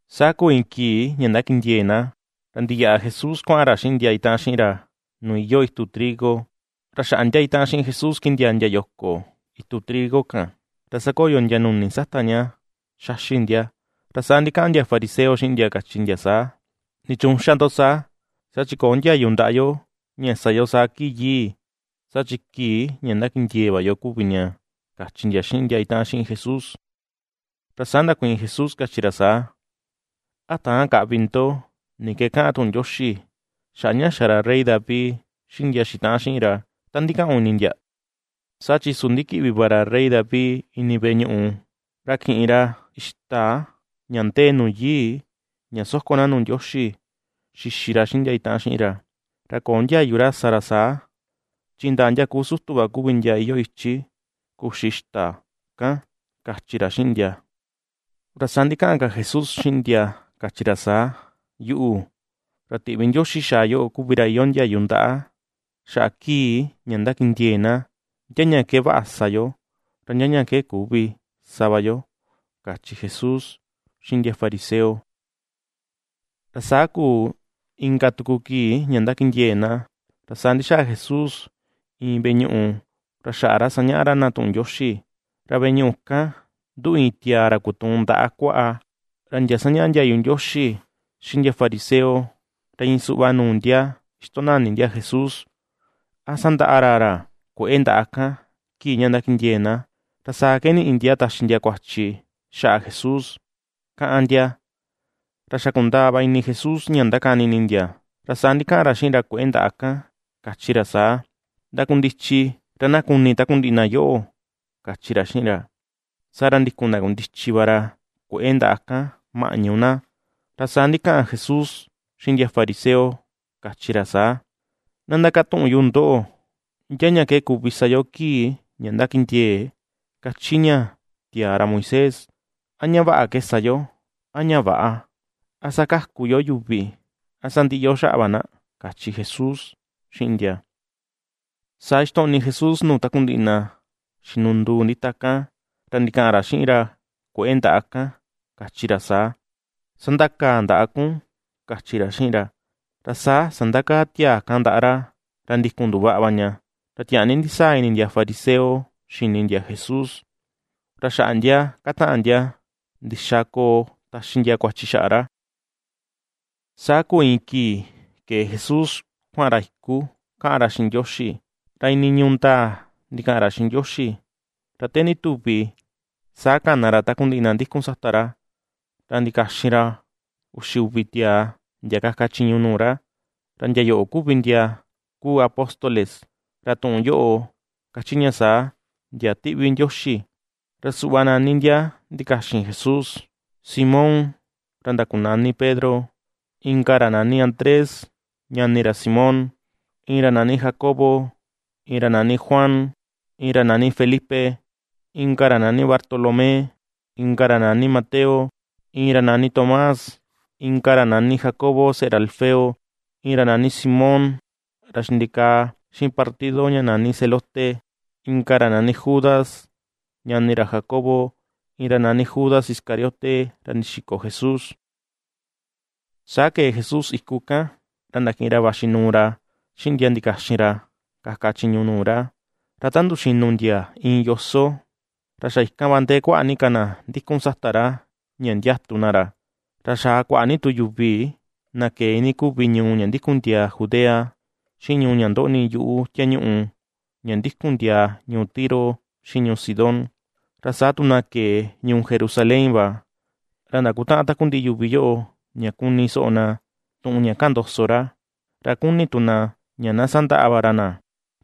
Saa kuu iin kii ña ndakindiee̱ na, ra ndiyaꞌa Jesús kuaꞌan ra xiꞌin ndia itaꞌan xiꞌin ra, nuu iyoo itu trigo. Ra xaꞌa ndia itaꞌan xiꞌin Jesús kindiaa ndia yoko itu trigo kan. Ra sakoyo ndia nuni sata ña ^xaxi ndia. Ra saa ndikaꞌan ndia fariseo xiꞌin ndia, kachi ndia saa: ―¿Nichuun xa ndo saa?, saa chi köo ndiayu ndaꞌa yo, ña sa yo saa kii yii saa chi kii ña ñakindiee̱ va yo kuvi ña ―kachi ndia xiꞌin ndia itaꞌan xiꞌin Jesús. Ra saa ndakuiin Jesús, kachi ra saa: ―¿A täan kaꞌvi ndo ni ke kaꞌan tuꞌun Ndioxi xaꞌa ña xa ra rey David, xiꞌin ndia xitaꞌan xiꞌin ra, ta ndikaꞌun ini ndia? Saa chi su ndikiꞌvi va ra Rey David ini veꞌe ñuꞌu, ra kiꞌin ra ixta ña ndee nu yii ña soko na nuu Ndioxi, xixi ra xiꞌin ndia itaꞌan xiꞌin ra. Ra köo ndiayu ra sa ra saa, chi indaa ndia ku sutu va kuvi ndia iyoo ichi kuxi ixta kan ―kachi ra xiꞌin ndia. Ra saa ndikaꞌan ka Jesús xiꞌin ndia kachi ra saa: ―Yuꞌu, ra tiꞌvi Ndioxi xaa yoꞌo kuvi ra iyoo ndiayu ndaꞌa xaꞌa kii ña ndakindiee̱ na ndia ña ke vaꞌa sa yo, ra ndia ña ke küvi sa va yo ―kachi Jesús xiꞌin ndia fariseo. Ra saa kuu, inka tuku kii ña ndakindiee̱ na ra saa ndixaa Jesús iin veꞌe ñuꞌu ra xaꞌa ra sañaꞌa ra na tuꞌun Ndioxi. Ra veꞌe ñuꞌu kan nduꞌu iin tiaa ra kutuun ndaꞌa kuaꞌa. Ra ndia sañaꞌa ndiayu Ndioxi xiꞌin ndia fariseo ra iin suꞌva nuu ndia ixtonani ndia Jesús, a sandaꞌa ra ra kue̱ꞌe ndaꞌa kan kii ña ndakindiee̱ na, ra saa ke niꞌi ndia taxi ndia kuachi xaꞌa Jesús, káꞌán ndia. Ra xa kundaa va ini Jesús ña ndakani ini ndia. Ra saa ndikaꞌan ra xiꞌin ra kue̱ꞌe ndaꞌa kan, kachi ra saa: ―Ndakundichi ra na kuni takundiꞌi na yoꞌo ―kachi ra xiꞌin ra. Saa ra ndikun ndakundichi va ra kue̱ꞌe ndaꞌa kan maꞌñu na. Ra saa ndikaꞌan Jesús xiꞌin ndia fariseo, kachi ra saa: ―Na ndakatuꞌun yu ndoꞌo. ¿Ndia ña ke kuvi sa yo kii ña ndakindiee̱ kachi ña tiaa ra Moisés? ¿A ña vaꞌa ke sa yo, a ña väꞌa? ¿A sakaku yo yuvi, a sandiꞌi yo xaꞌa va na? ―kachi Jesús xiꞌin ndia. Saa ixtoꞌni Jesús nuu takundiꞌi na xinunduu ndita kan, ra ndikaꞌan ra xiꞌin ra kue̱ꞌe ndaꞌa kan kachi ra saa: ―Sandakaa ndaꞌa kun ―kachi ra xiꞌin ra. Ra saa sandakaa tiaa kan ndaꞌa ra, ra ndikun nduvaꞌa va ña. Ra tiaa ni ndisaa ini ndia fariseo xini ndia Jesús. Ra xaꞌa ndia kataꞌan ndia ndixa koo taxi ndia kuachi xaꞌa ra. Saa kuu iin kii ke̱e Jesús kuaꞌan ra iku kaꞌan ra xiꞌin Ndioxi, ra iinii ñuu ndaa ndikaꞌan ra xiꞌin Ndioxi. Ra te ndituvi saa kana ra takundiꞌi na ndikun sata ra, ra ndikaxin ra uxi uvi tiaa, ndia kaka chiñu nuu ra. Ra ndia yoꞌo kuvi ndia kuu apóstoles, ra tuꞌun yoꞌo kachi ña saa: “Ndia ^tiꞌvi Ndioxi.” Ra suꞌva nani ndia ndikaxin Jesús: Simón ra ndakunani Pedro, inka ra nani Andrés ñani ra Simón, iin ra nani Jacobo, iin ra nani Juan, iin ra nani Felipe, inka ra nani Bartolomé, inka ra nani Mateo, iin ra nani Tomás, inka ra nani Jacobo seꞌe ra Alfeo, iin ra nani Simón ra xindikaa xiꞌin partido ña nani Zelote, inka ra nani Judas, ñani ra Jacobo, iin ra nani Judas Iscariote ra ndixiko Jesús. Saa ke̱e Jesús iku kan ra ndakiꞌin ra vaxi nuu ra xiꞌin ndia ndakaxin ra kaka chiñu nuu ra. Ra ta nduxinu ndia iin yoso, ra xa ikan va ndee kuaꞌa ni ka na ndikun sata ra ña ndiatu na ra. Ra xaa kuaꞌa ni tu yuvi, na ke̱e iinii kuvi ñuu ña ndikun ndiaa Judea, xiꞌin ñuu ña ndoꞌni yuꞌu tiañuꞌu, ña ndikun ndiaa ñuu Tiro xiꞌin ñuu Sidón, ra saa tu na ke̱e ñuu Jerusalén va. Ra ndakutaꞌan takundiꞌi yuvi yoꞌo ña kuni soꞌo na tuꞌun ña kaꞌan ndoso ra, ra kuni tu na ña na sandaꞌa va ra na.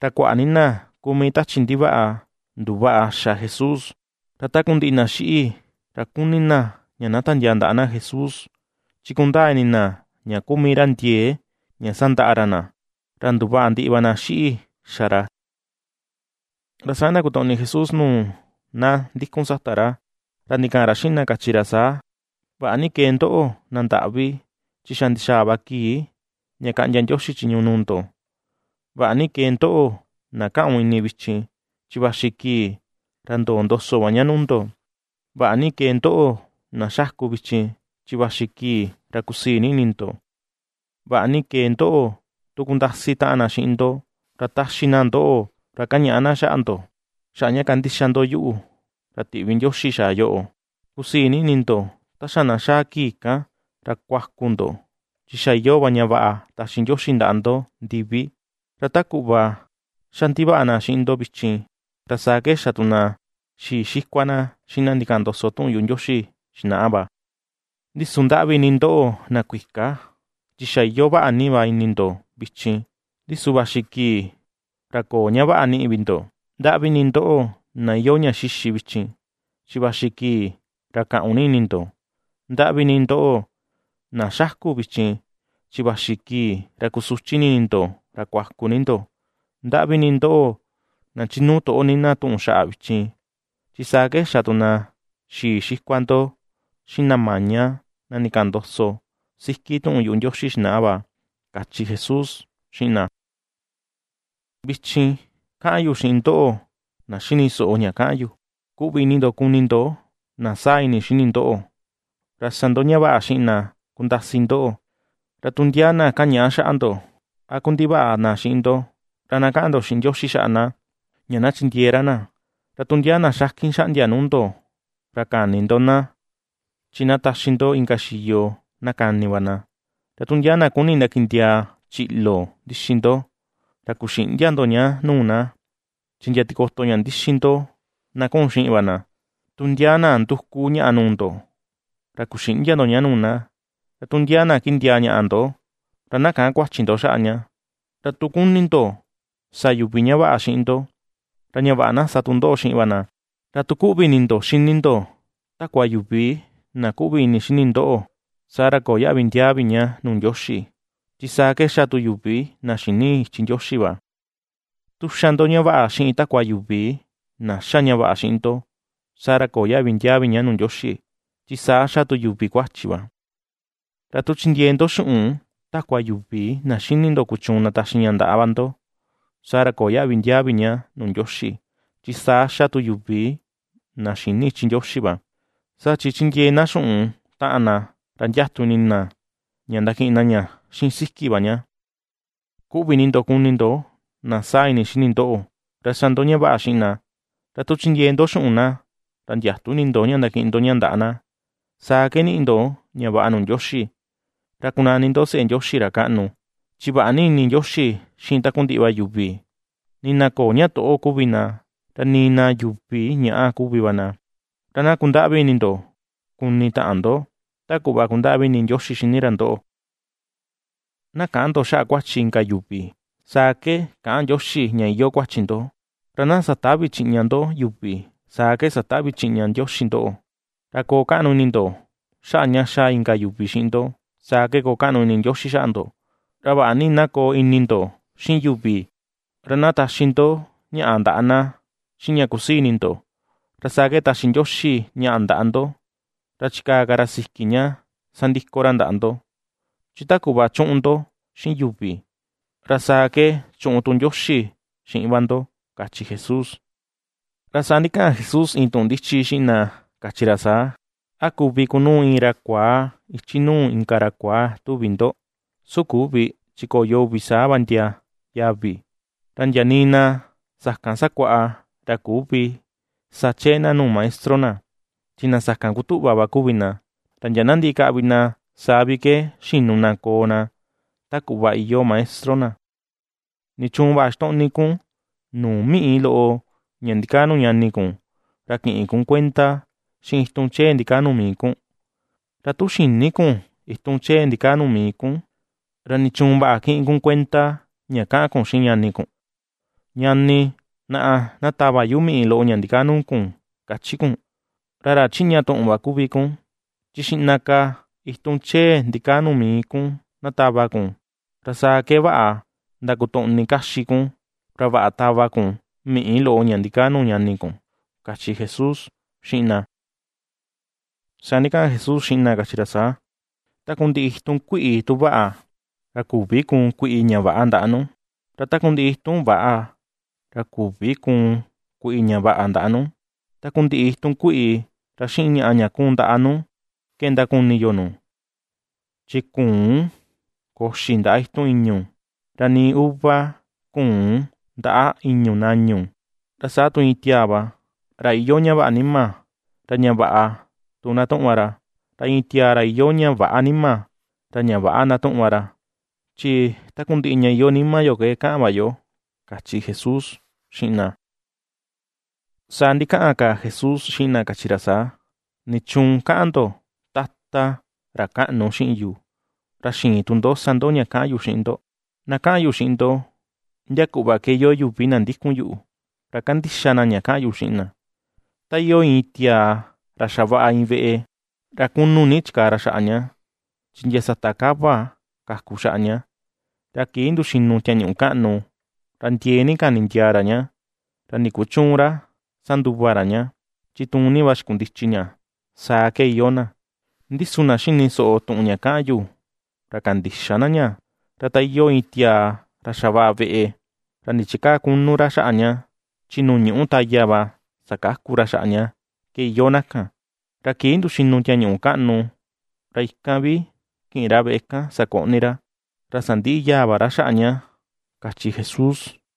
Ra kuaꞌa ni na ku mii tachi ndivaꞌa, nduvaꞌa xa Jesús. Ra takundiꞌi na xiꞌi, ra kuni na ña tiandiaa ndaꞌa na Jesús, chi kundaa ini na ña ku mii ra ndie̱e̱ ña sandaꞌa ra na, ra nduvaꞌa ndiꞌi va na xiꞌi xa ra. Ra saa ndakotoꞌni Jesús nuu na ndikun sata ra, ra ndikaꞌan ra xiꞌin na, kachi ra saa: ―Vaꞌa ni kee ndoꞌo, na ndaꞌvi, chi xa ndixaa va kii ña kaꞌndia Ndioxi chiñu nuu ndo. ’Vaꞌa ni kee ndoꞌo, na kaꞌun ini vichin, chi vaxi kii ra ndoo ndoso va ña nuu ndo. Vaꞌa ni kee ndoꞌo na xaku vichin, chi vaxi kii ra kusii ni ini ndo. ’Vaꞌa ni kee ndo tu kundasi taꞌan na xiꞌin ndo, ra taxi na ndoꞌo, ra kañaꞌa na xaꞌa ndo, xaꞌa ña kandixa ndo yuꞌu, ra tiꞌvi Ndioxi xaa yoꞌo. Kusii ni ini ndo ta xa na xaa kii kan, ra kuaku ndo, chi xa iyoo va ña vaꞌa taxi Ndioxi ndaꞌa ndo ndivi. Ra ta kuꞌva ^xa ndivaꞌa na xiꞌin ndo vichin, ra saa ke xa tu na xii xikua na xiꞌin na ndikaꞌan ndoso tuꞌun yuꞌu Ndioxi xinaꞌa va. ’Ndi su ndaꞌvi ni ndoꞌo na kuika, chi xa iyoo vaꞌa ni va ini ndo vichin, ndi su vaxi kii ra köo ña vaꞌa niꞌi vi ndo. ’Ndaꞌvi ni ndoꞌo, na iyoo ña xixi vichin, chi vaxi kii ra kaꞌun ni ini ndo. ’Ndaꞌvi ni ndoꞌo, na ^xáku̱ vichin, chi vaxi kii ra kusuchi ni ini ndo ra kuaku ni ndo. ’Ndaꞌvi ni ndoꞌo, na chinuu toꞌo ni na tuꞌun xaꞌa vichin, chi saa ke xa tu na xii xikua ndo xiꞌin na maña, na ndikaꞌan ndoso siki tuꞌun yuꞌu Ndioxi xinaꞌa va ―kachi Jesús xiꞌin na. Vichin ^kaꞌan yu xiꞌin ndoꞌo na xini soꞌo ña kaꞌan yu: ―Kuꞌvi ini ndo kuni ndo na saa ini xini ndoꞌo; ra sa ndo ña vaꞌa xiꞌin na kundasi ndoꞌo. Ra tu ndia na kañaꞌa xaꞌa ndo, a kundivaꞌa na xiꞌin ndo, ra na kaꞌan ndo xiꞌin Ndioxi xaꞌa na, ña na chindiee ra na. Ra tu ndia na xakin xaꞌndia nuu ndo, ra käni ndo na. Chi na taxi ndo inka xiyo, na kani va na. Ra tu ndia na kuni ndakindiaa chiꞌlo ndixi ndo, ra kuxïꞌndia ndo ña nuu na; chi ndia tikoto ña ndixi ndo na kuꞌun xiꞌin va na. Tu ndia na nduku ñaꞌa nuu ndo, ra kuxïꞌndia ndo ña nuu na. Ra tu ndia na kindiaa ñaꞌa ndo, ra na käꞌan kuachi ndo xaꞌa ña. Ra tu kuni ndo sa yuvi ña vaꞌa xiꞌin ndo, ra ña vaꞌa na sa tu ndoꞌo xiꞌin va na. ’Ra tu kuꞌvi ini ndo xini ndo takua yuvi na kuꞌvi ini xini ndoꞌo, saa ra, köo yaꞌvi ndiaa vi ña nuu Ndioxi, chi saa ke xa tu yuvi na xïni ichi Ndioxi va. Tu xa ndo ña vaꞌa xiꞌin takua yuvi, na xa ña vaꞌa xiꞌin ndo, saa ra köo yaꞌvi ndiaa vi ña nuu Ndioxi, chi saa xa tu yuvi kuachi va. Ra tu chindiee ndo xuꞌun takua yuvi, na xini ndo kuchuun ndataxi ña ndaꞌa va ndo, saa ra köo yaꞌvi ndiaa vi ña nuu Ndioxi, chi saa xa tu yuvi na xïni ichi Ndioxi va: saa chi chindiee na xuꞌun taꞌan na ra ndiatu ini na ña ndakiꞌin na ña xiꞌin siki va ña. Kuꞌvi ini ndo kuni ndo na saa ini xini ndoꞌo, ra sa ndo ña vaꞌa xiꞌin na. Ra tu chindiee ndo xuꞌun na ra ndiätu ini ndo ña ndakiꞌin ndo ña ndaꞌa na. Saa ke niꞌi ndo ña vaꞌa nuu Ndioxi, ra kunani ndo seꞌe Ndioxi ra kaꞌnu. Chi vaꞌa ni ini Ndioxi xiꞌin takundiꞌi va yuvi, nii na köo ña toꞌo kuvi na, ra nii na yuvi ñaꞌa kuvi va na. Ra na kundaꞌvi ini ndo kuni taꞌan ndo, ta kuꞌva kundaꞌvi ini Ndioxi xini ra ndoꞌo. ’Na käꞌan ndo xaꞌa kuachi inka yuvi, saa ke käꞌan Ndioxi ña iyoo kuachi ndo. Ra na satävi chiꞌña ndo yuvi, saa ke satävi chiꞌña Ndioxi ndoꞌo. Ra koo kaꞌnu ini ndo xaꞌa ña xa inka yuvi xiꞌin ndo, saa ke koo kaꞌnu ini Ndioxi xaꞌa ndo. Ra vaꞌa ni na koo ini ndo xiꞌin yuvi; ra na taxi ndo ñaꞌa ndaꞌa na xiꞌin ña kusii ini ndo, ra saa ke taxi Ndioxi ñaꞌa ndaꞌa ndo. Ra chikaa ka ra siki ña sandiko ra ndaꞌa ndo, chi ta kuꞌva chuꞌun ndo xiꞌin yuvi, ra saa ke chuꞌun tu Ndioxi xiꞌin va ndo ―kachi Jesús. Ra saa ndikaꞌan Jesús iin tuꞌun ndichi xiꞌin na kachi ra saa: ―¿A kuvi kunuu iin ra kuaa ichi nuu inka ra kuaa, tuvi ndo? Su küvi chi koyo uvi saa va ndia yavi. Ra ndia nii na sakan sakuaꞌa ra küvi sa chee na nuu maestro na, chi na sakan kutuꞌva va kuvi na. Ra ndia na ndiꞌi kaꞌvi na, saa vi ke xinu na koo na ta kuꞌva iyoo maestro na. ’¿Nichuun vaꞌa ixtoꞌni kun nuu miꞌi loꞌo ña ndikaa nuu ñani kun, ra kïꞌin kun kuenda xiꞌin itun chee ndikaa nuu mii kun? Ra tu xïni kun itun chee ndikaa nuu mii kun, ¿ra nichuun vaꞌa kiꞌin kun kuenda ña kaꞌan kun xiꞌin ñani kun: “Ñani, naꞌa, na tava yu miꞌi loꞌo ña ndikaa nuu kun”, kachi kun? ¡Ra ra chiꞌña tuꞌun va kuvi kun! Chi xiꞌna ka itun chee ndikaa nuu mii kun na tava kun. Ra saa ke vaꞌa ndakotoꞌni kaxi kun, ra vaꞌa tava kun miꞌi loꞌo ña ndikaa nuu ñani kun ―kachi Jesús xiꞌin na. Saa ndikaꞌan Jesús xiꞌin na, kachi ra saa: ―Takundiꞌi itun kuiꞌi tu vaꞌa, ra küvi kuun kuiꞌi ña väꞌa ndaꞌa nu. Ra takundiꞌi itun väꞌa, ra küvi kuun kuiꞌi ña vaꞌa ndaꞌa nu. Takundiꞌi itun kuiꞌi ra xiꞌin ñaꞌa ña kuun ndaꞌa nu ke ndakuni yo nu. Chi küun koxi ndaꞌa itun ìñu̱, ra nii uva küun ndaꞌa ìñu̱ nañu. Ra saa tu iin tiaa va, ra iyoo ña vaꞌa nima, ra ña vaꞌa tu ndatuꞌun va ra. Ra iin tiaa ra iyoo ña väꞌa nima, ra ña väꞌa ndatuꞌun va ra. Chi takundiꞌi ña iyoo nima yo ke kaꞌan va yo ―kachi Jesús xiꞌin na. Saa ndikaꞌan ka Jesús xiꞌin na, kachi ra saa: ―¿Nichuun kaꞌan ndo, “Tata, Ra Kaꞌnu”, xiꞌin yu, ra xïin tu ndo sa ndo ña kaꞌan yu xiꞌin ndo? Na kaꞌan yu xiꞌin ndo, ndia kuꞌva ke iyoo yuvi na ndikun yuꞌu, ra kandixa na ña kaꞌan yu xiꞌin na. Ta iyoo iin tiaa ra xavaꞌa iin veꞌe, ra kunu ni chikaa ra xaꞌa ña, chi ndia sata kava kaku xaꞌa ña, ra kii nduxinu tiañuꞌu kaꞌnu, ra ndiee ni kani ndiaa ra ña, ra ndikuchüun ra sanduva ra ña, chi tuun ni va xikundichi ña, saa ke iyoo na. Ndi su na xini soꞌo tuꞌun ña kaꞌan yu, ra kandïxa na ña, ra ta iyoo iin tiaa ra xavaꞌa veꞌe, ra ndichikäa kunu ra xaꞌa ña, chi nuu ñuꞌu taya va sakaku ra xaꞌa ña, ke iyoo na kan. Ra kii nduxinu tiañuꞌu kaꞌnu, ra ikan vi kiꞌin ra veꞌe kan sakoꞌni ra, ra sandiꞌi yaa va ra xaꞌa ña ―kachi Jesús.